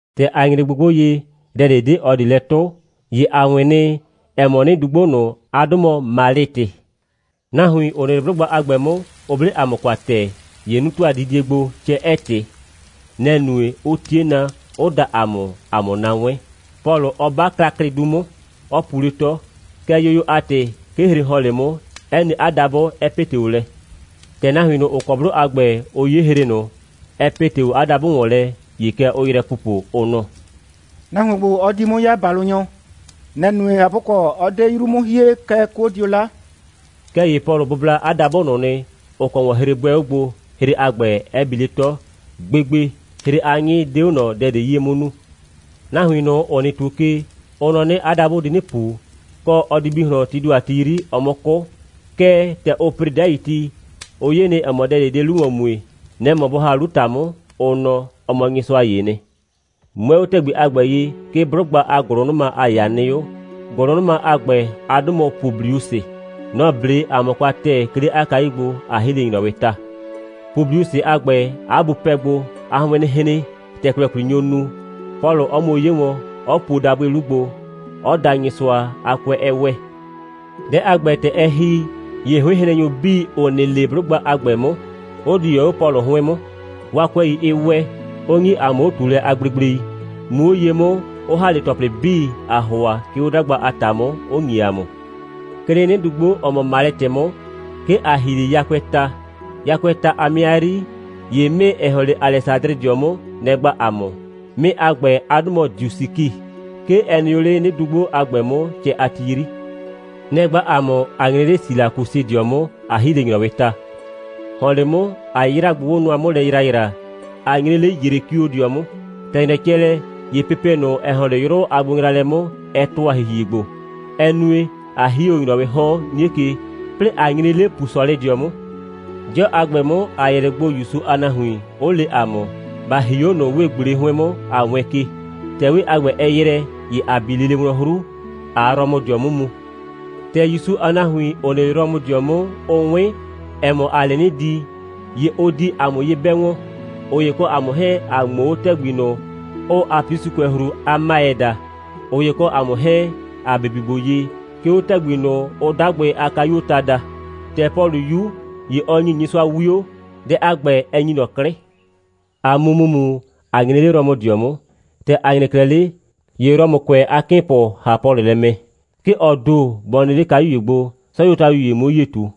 ‑Tɛ ‑a nyre gbogbo ye, dɛ ꞊de 'de ꞊ɔ ꞊de lɛ 'tʋ, ‑ye ‑a 'wɩn nɩ, ‑ɛ mɔ, 'nɩdugbo ꞊nʋ, 'a 'dʋ mɔ Malɩtɩ. Nahuin, ‑ʋ nɩ 'le 'blʋgba a ‑gbɛ 'mʋ, ʋ 'ble ‑a mʋ kwa ‑tɛɛ. ‑Ye 'nu ‑tʋa didie gbo, cɛ 'ɛɛ ꞊tɩ. Nɛ‑ nue, 'ʋ 'tie na, 'ʋ da ‑a mʋ, ‑a 'mʋ na 'wɛn, Pɔlʋ 'ɔ 'ba klaklɩdu 'mʋ, 'ɔ pu 'le 'tɔ. Kɛɛ, yoyo a ‑tɩ, 'ke hre ‑hɔn 'le 'mʋ, 'ɛ ne 'a dabʋ, 'ɛ ‑pete 'o lɛ. ‑Tɛ nahuin ꞊nʋ, ‑ʋ kɔ 'blʋ a ‑gbɛ, ʋ 'ye hre ꞊nʋ, ‑ɛ ‑pete 'o Pɔlʋ a dabʋ ‑wɔn lɛ, ‑ye kɛ ʋʋ yrɛ pupo, ʋ nɔ: «Nahuon ‑gbo, ɔ di 'mʋ 'ya ‑balʋnyɔ. Nɛ‑ nue, ꞊hapʋkɔ, 'ɔ 'de 'yru 'mʋ hie, kɛɛ, 'kuo dio 'la.» Kɛɛ ‑ye Pɔlʋ bʋbla 'a dabʋ ꞊nʋ nɩ, ‑ʋ kɔ ‑wɔn hre 'bʋɛ 'o gbo, hre a ‑gbɛ 'ɛ bi 'le 'tɔ. Gbegbe, hre a 'nyɩ 'de 'o ꞊nɔ dɛ ꞊de 'yie 'mʋ nu. Nahuin ꞊nʋ, ‑ʋ nɩ ‑tuo ke, ʋ nɔ 'nɩ, 'a dabʋ di 'nɩ ꞊pu, kɔ, ɔ di bi ꞊hlɔn, tii ‑do a ti 'yri, ɔ 'mʋ 'kʋ. Kɛɛ, ‑tɛ ʋ ‑pre 'dai ti, ʋ 'ye nɩ, ‑ɛ mɔ, dɛ ꞊de 'de 'lu ‑wɔn mue. Nɛ‑ mɔ bʋ ‑ha 'lu ‑ta 'mʋ, ʋ nɔ, ɔ mɔ nyɩsʋa ‑yee nɩ. 'Mʋɛɛ 'o ‑tɛgbi a ‑gbɛ ye, 'ke 'blʋgba a ‑gʋlʋnʋma a ‑yaa nɩ 'o. ‑Gʋlʋnʋma a ‑gbɛ, 'a 'dʋ mɔ Publiusɩ. Nɔ‑ 'ble ‑a mʋ kwa ‑tɛɛ, 'ke 'le 'a kayu gbo, ꞊a ‑hi 'le ‑nyrɔwɩɩ ta. Publiusɩ a ‑gbɛ, 'a bu pɛ gbo, 'a 'hʋɩɩn 'nɩ hren, ‑tɛklɛkwli nyo nu, Pɔlʋ 'ɔ muo 'ye wɔn, 'ɔ puo dabʋɩ 'lu gbo, 'ɔ da Nyɩsʋa, 'a 'kʋɛ 'ɛ ‑wɛ. Dɛ a ‑gbɛ, ‑tɛ ɛ ‑hi, ‑ye 'hʋɩnhrennyʋ 'bii, ‑ʋ nɩ 'le 'blʋgba a ‑gbɛ 'mʋ, 'ʋ di ‑wɛ 'o Pɔlʋ 'hʋɩn 'mʋ, 'waa 'kʋɛi 'ɩ ‑wɛ, 'ʋ ‑nyi ‑a mʋ 'o꞊tuulɛ a gblegblei, muu 'o ye 'mʋ, 'ʋ ‑ha 'le ‑tɔplɩ 'bii, ‑aa ‑hʋa, 'ke 'o 'dagba a ‑ta 'mʋ, 'ʋ ‑nyi ‑a mʋ. 'Ke 'le 'nɩdugbo, ‑ɔ mɔ Malɩtɩ 'mʋ, 'ke ‑a ‑hi 'le yakʋɛɛ ta. Yakʋɛɛ ta a 'mɩa 'yri, ‑ye 'mɩɩ, ‑ɛ ‑hɔn 'le Alɛsadrɩdɩɔ 'mʋ, nɛ‑ gba ‑a mʋ. 'Mɩɩ a ‑gbɛ a 'dʋ mɔ Diosiki. 'Ke ɛ nɩ o 'le 'nɩdugbo a ‑gbɛ 'mʋ, cɛ a ti 'yri. Nɛ‑ gba ‑a mʋ, ꞊a nyre 'le Silakusɩdɩɔ 'mʋ, ꞊a ‑hi 'le ‑nyrɔwɩɩ ta. ‑Hɔn 'le 'mʋ, ‑a 'yraa gbogbo nʋa 'mʋ lɛ ‑yraayraa, ꞊a nyre 'le Yrekiodɩɔ 'mʋ. ‑Tɛ ‑nyrɛ cɛ lɛ, ‑ye pepe ꞊nʋ, ‑ɛ ‑hɔn 'le 'yrʋ a gbonyraalɛ 'mʋ, ɛ ‑tʋa ‑hihie gbo, ɛ nue, ꞊a ‑hi 'o ‑nyrɔwɩɩ 'hɔn 'nie ke, 'plɩɩ ꞊a nyre 'le Pusɔlɩdɩɔ 'mʋ. 'Dɩɔ a ‑gbɛ 'mʋ, ‑a yɛ 'le gbo ‑Yusu a nahuin, 'ʋ le ‑a mʋ, ‑ba ‑hi 'o ꞊nʋ 'wee꞊gble 'hʋɩn 'mʋ, ꞊a wɛɛn ke. ‑Tɛ 'wee a ‑gbɛ, ɛ ‑yrɛ, ‑ye ‑a bi lele wlɔn 'hru, ꞊aa Rɔmʋdɩɔ 'mʋ mu. ‑Tɛ ‑Yusu a nahuin, ‑ʋ nɩ 'le Rɔmʋdɩɔ 'mʋ, ʋ 'wɩn, ‑ɛ mɔ, ‑aa 'le 'nɩ di, ‑ye ʋ di ‑a mʋ ye 'bɛ wɔn, ꞊ʋ ‑ye kɔ ‑a mʋ 'hɛɛn, ꞊a ꞊ŋmoo 'o ‑tɛgbi ꞊nʋ, ʋʋ Apiusɩkʋɛhru a 'Maɩ daa, ꞊ʋ ‑ye kɔ ‑a mʋ 'hɛɛn, ‑a bibi gbo ye, 'ke 'o ‑tɛgbi ꞊nʋ, ʋʋ 'Dagbɩ a Kayuoo Ta daa. ‑Tɛ Pɔlʋ 'yu, ‑ye ɔ ‑nyi Nyɩsʋa 'wio, dɛ a ‑gbɛ 'ɛ ‑nyi ꞊nɔ 'klɩ, ꞊a mu ‑mumu, ꞊a nyre 'le Rɔmʋdɩɔ 'mʋ. ‑Tɛ ‑a nyre 'klɛɛ 'le, ‑ye Rɔmʋkʋɛ a 'kɩɩnpʋ ‑ha Pɔlʋ lɛ mɛ, 'ke ɔ ‑do bɔ nɩ 'le kayu ‑ye gbo, 'sɔyuotayu ‑ye 'muo 'yie ꞊tu.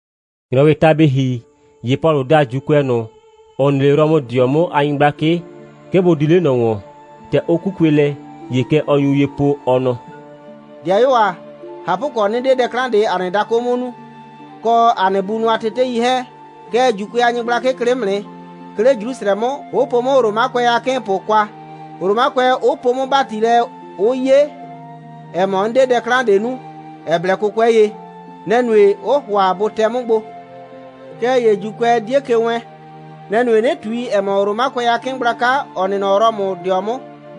‑Nyrɔwɩɩ ta bɩ ‑hi, ‑ye Pɔlʋ da ‑Juukʋɛ ꞊nʋ, ‑ʋ nɩ 'le Rɔmʋdɩɔ 'mʋ a nyɩgblakɩ, 'ke bʋ di 'le ꞊nɔ ‑wɔn. ‑Tɛ ʋ 'kukue lɛ, ‑ye kɛ ɔ nyu ye po, ɔ nɔ: «‑Dɩayuo ‑a, ꞊hapʋkɔ, 'nɩ 'de dɛ 'klan ꞊de ‑a nɩ dakʋ 'mʋ nu, kɔ ‑a nɩ bunʋ a tetei 'hɛɛn, kɛɛ, ‑Juukʋɛ a nyɩgblakɩ klɩ 'mʋ nɩ, 'ke 'le Jrusrɛ 'mʋ, 'ʋ po 'mʋ Romakʋɛ a 'kɩɩnpʋ kwa, Romakʋɛ 'ʋ poo 'mʋ ‑bati lɛ, 'ʋ 'ye, ‑ɛ mɔ, 'n 'de dɛ 'klan ꞊de nu, ‑ɛ blɛ 'kʋkʋɛ ye. Nɛ‑ nue, 'ʋʋ ‑hʋa bʋ tɛ 'mʋ gbo. Kɛɛ ‑ye ‑Juukʋɛ 'die ke wɛɛn. Nɛ‑ nue, 'nɩ ꞊tui, ‑ɛ mɔ, Romakʋɛ a 'kɩɩn gblaka, ‑ɔ nɩ nɔ Rɔmʋdɩɔ 'mʋ,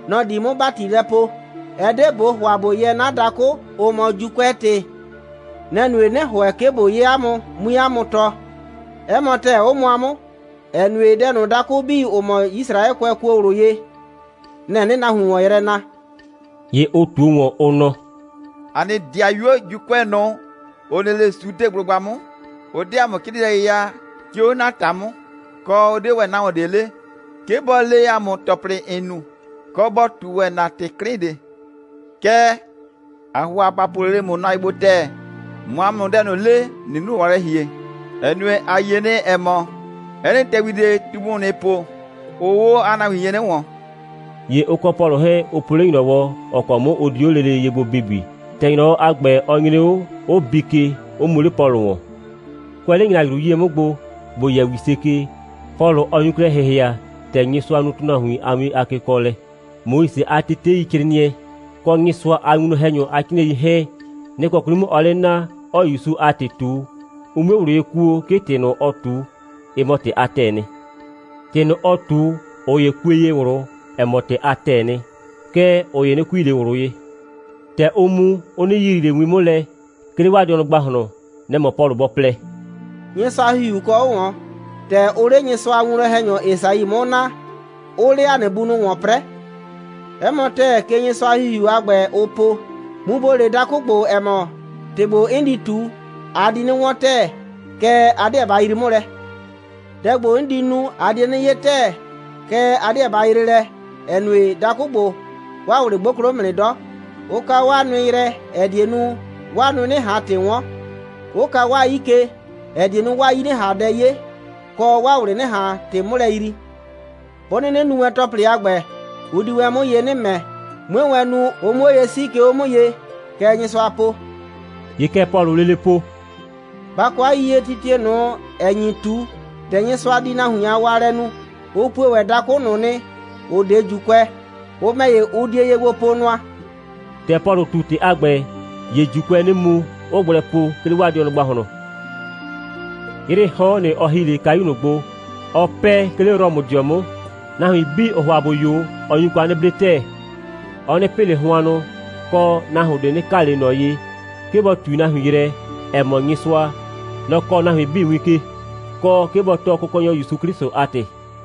nɔ‑ di 'mʋ ‑bati lɛ poo. Ɛ 'de ꞊bo ‑hʋa ꞊bo yɛɛ 'na dakʋ, ʋ mɔ ‑Juukʋɛ ‑tɩ. Nɛ‑ nue, 'nɩ ‑hʋɛ, 'ke ꞊bo 'ye 'a mʋ, 'mui 'a mʋ tɔɔ. 'Ɛ mɔ ‑tɛɛ, 'ʋ mʋa 'mʋ, ‑ɛ nue, dɛ ꞊nʋ, dakʋ 'bii, ‑ʋ mɔ Yisraɛkʋɛ kuo ꞊wlʋ ye, nɛ‑ 'nɩɩ nahuin ‑wɔn yrɛ na.» ‑Ye ʋ ꞊tuo ‑wɔn, ʋ nɔ: «‑A nɩ 'dɩayuo ‑Juukʋɛ ꞊nʋ, ‑ʋ nɩ 'le Sudeblʋgba 'mʋ, ʋ 'de ‑a mʋ 'crɩɩnɩɛ ye ya, 'ke 'o ‑na ‑ta 'mʋ, kɔ, ʋ 'de ‑wɛ nahuon ꞊de le, 'ke bɔ le ‑a mʋ ‑tɔplɩ, ‑n nu, kɔ, bɔ ꞊tu ‑wɛ ‑na ‑tɩ 'klɩn ꞊de. Kɛɛ, ‑aa ‑hʋa ‑ba po lele ‑mʋ nʋa ye gbo ‑tɛɛ, ꞊mʋ ‑a mʋ dɛ ꞊nʋ le, ‑nɩɩ 'lu ‑wɔn lɛ ‑hie, ‑ɛ nue, ‑a yie nɩ, ‑ɛ mɔ, 'ɛ nɩ ‑tɛgbi ꞊de, ꞊tumu, ‑nɩɩ po, ʋʋ 'o 'a nahuin ye 'nɩ ‑wɔn.» ‑Ye ʋ kɔ Pɔlʋ 'hɛɛn, ʋ po 'le ‑nyrɔwɔ, ‑ɔ kɔ 'mʋ ʋ di 'o lele ye gbo bibi. ‑Tɛ ‑nyrɔwɔ a ‑gbɛ, ɔ nyre 'o, ʋ bii ke, 'ʋ mu 'le Pɔlʋ ‑wɔn. Kʋɛ 'le ‑nyrajru 'yie 'mʋ gbo, ‑bo yɛ ‑wise ke, Pɔlʋ 'ɔ nyu klɛ ‑hɩhɩa, ‑tɛ Nyɩsʋa nu ‑tʋnahuin a win a kekɔɔlɛ. Moise a teteicrɩɩnɩɛ, kɔ Nyɩsʋa a winwlɔn‑hɛnyʋ a 'crɩɩnɩɛi 'hɛɛn, nɩ‑ kɔ 'kwli 'mʋ ɔɔ 'le naa, 'ɔɔ ‑Yusu a ‑tɩ ꞊tu, ʋ 'mue ꞊wlʋ ye kuo, 'ke ‑tɩ ꞊nʋ, ɔɔ ꞊tu, ɩ mɔ ‑tɩ a ‑tɛɛ nɩ. ‑Tɩ ꞊nʋ, ɔ ꞊tu, ꞊ʋ ‑ye kue ye ꞊wlʋ, ‑ɛ mɔ, ‑tɩ a ‑tɛɛ nɩ. Kɛɛ, ꞊ʋ ‑ye 'nɩ kui ꞊le ꞊wlʋ ye. ‑Tɛ ʋʋ mu, ʋ 'nɩ yiyrii ꞊le win 'mʋ lɛ, 'ke 'le 'waa dɩɔnʋ ‑gbahlɔn. Nɛ‑ mɔ Pɔlʋ bɔ plɛ: «Nyɩsʋa a ‑Hihiu kɔ 'o ꞊wɔn, ‑tɛ ʋʋ 'le Nyɩsʋa a winwlɔn‑hɛnyɔ Esai 'mʋ naa, 'ʋʋ 'le ‑a nɩ bunʋ ‑wɔn 'prɛɛ. 'Ɛ mɔ ‑tɛɛ, kɛ Nyɩsʋa a ‑Hihiu a ‑gbɛ, ʋ po: Mu ‑bo le dakʋ ‑gbo, ‑ɛ mɔ, ‑tɩ ‑gbo, 'n di ꞊tu, a di 'nɩ 'wɔn ‑tɛɛ, kɛɛ, a 'deɛ ba yrii 'mʋ lɛ; dɛ ‑gbo, 'n di nu, a die 'nɩ 'ye ‑tɛɛ, kɛɛ, a 'deɛ ba yree lɛ, ‑ɛ nue, dakʋ ‑gbo, 'waa ꞊wlɩ 'gboklo 'mʋ nɩ 'dɔ, 'ʋ ka 'waa nʋɩ yrɛ, ‑ɛ die nu, 'waa nʋɩ 'nɩ ꞊han ‑tɩ 'wɔn, 'ʋ ka 'waa 'yii ke, ‑ɛ die nu, 'waa 'yii 'nɩ ꞊han dɛ 'ye, kɔ, 'waa ꞊wlɩ 'nɩ ꞊han ‑tɩ 'mʋ lɛ yrii. 'Bʋ 'nɩnɩ nu wɛn ‑tɔplɩ a ‑gbɛ, ʋ di wɛn 'mʋ ye 'nɩ ‑mɛ, 'mue wɛn nu, ʋ 'mʋ 'o ye 'sii, 'ke 'o 'mʋ ye. Kɛ Nyɩsʋa po.» ‑Ye kɛ Pɔlʋʋ lele po: «Ba kɔ 'a yiyie, titie ꞊nʋ, ‑ɛ nyi ꞊tu, ‑tɛ Nyɩsʋa di nahuin a waalɛ nu, ʋ pue ‑wɛ dakʋ ꞊nʋ nɩ, ‑ʋ 'de ‑Juukʋɛ. Ʋ ‑mɛ ‑ye, ʋ die ye gbo po nʋa.» [ ‑Tɛ Pɔlʋ ꞊tu ‑tɩ a ‑gbɛ, ‑ye ‑Juukʋɛɛ 'nɩ mu, 'ʋʋ gblɛ po, 'ke 'le 'waa dɩɔnʋ ‑gbahlɔn.] 'Yrɩɩ 'hɔn, nɩ‑ ɔ ‑hi 'le kayu ꞊nʋ gbo, ɔɔ 'pɛɛ, 'ke 'le Rɔmʋdɩɔ 'mʋ. Nahuin 'bii, ‑ʋʋ ‑hʋa ‑bʋ 'yo, ɔ nyu kwa 'nɩ 'ble ‑tɛɛ. Ɔ 'nɩ pɩ ꞊le hʋannʋ, kɔ, nahuon ꞊de 'nɩ ka ꞊le ꞊nɔ ye, 'ke bɔ ꞊tui nahuin yrɛ, ‑ɛ mɔ, Nyɩsʋa, nɔ‑ kɔɔ nahuin 'bii win ke, kɔ, 'ke bɔ tɔɔ Kʋkɔnyɔ ‑Yusu 'Klɩsʋ a ‑tɩ.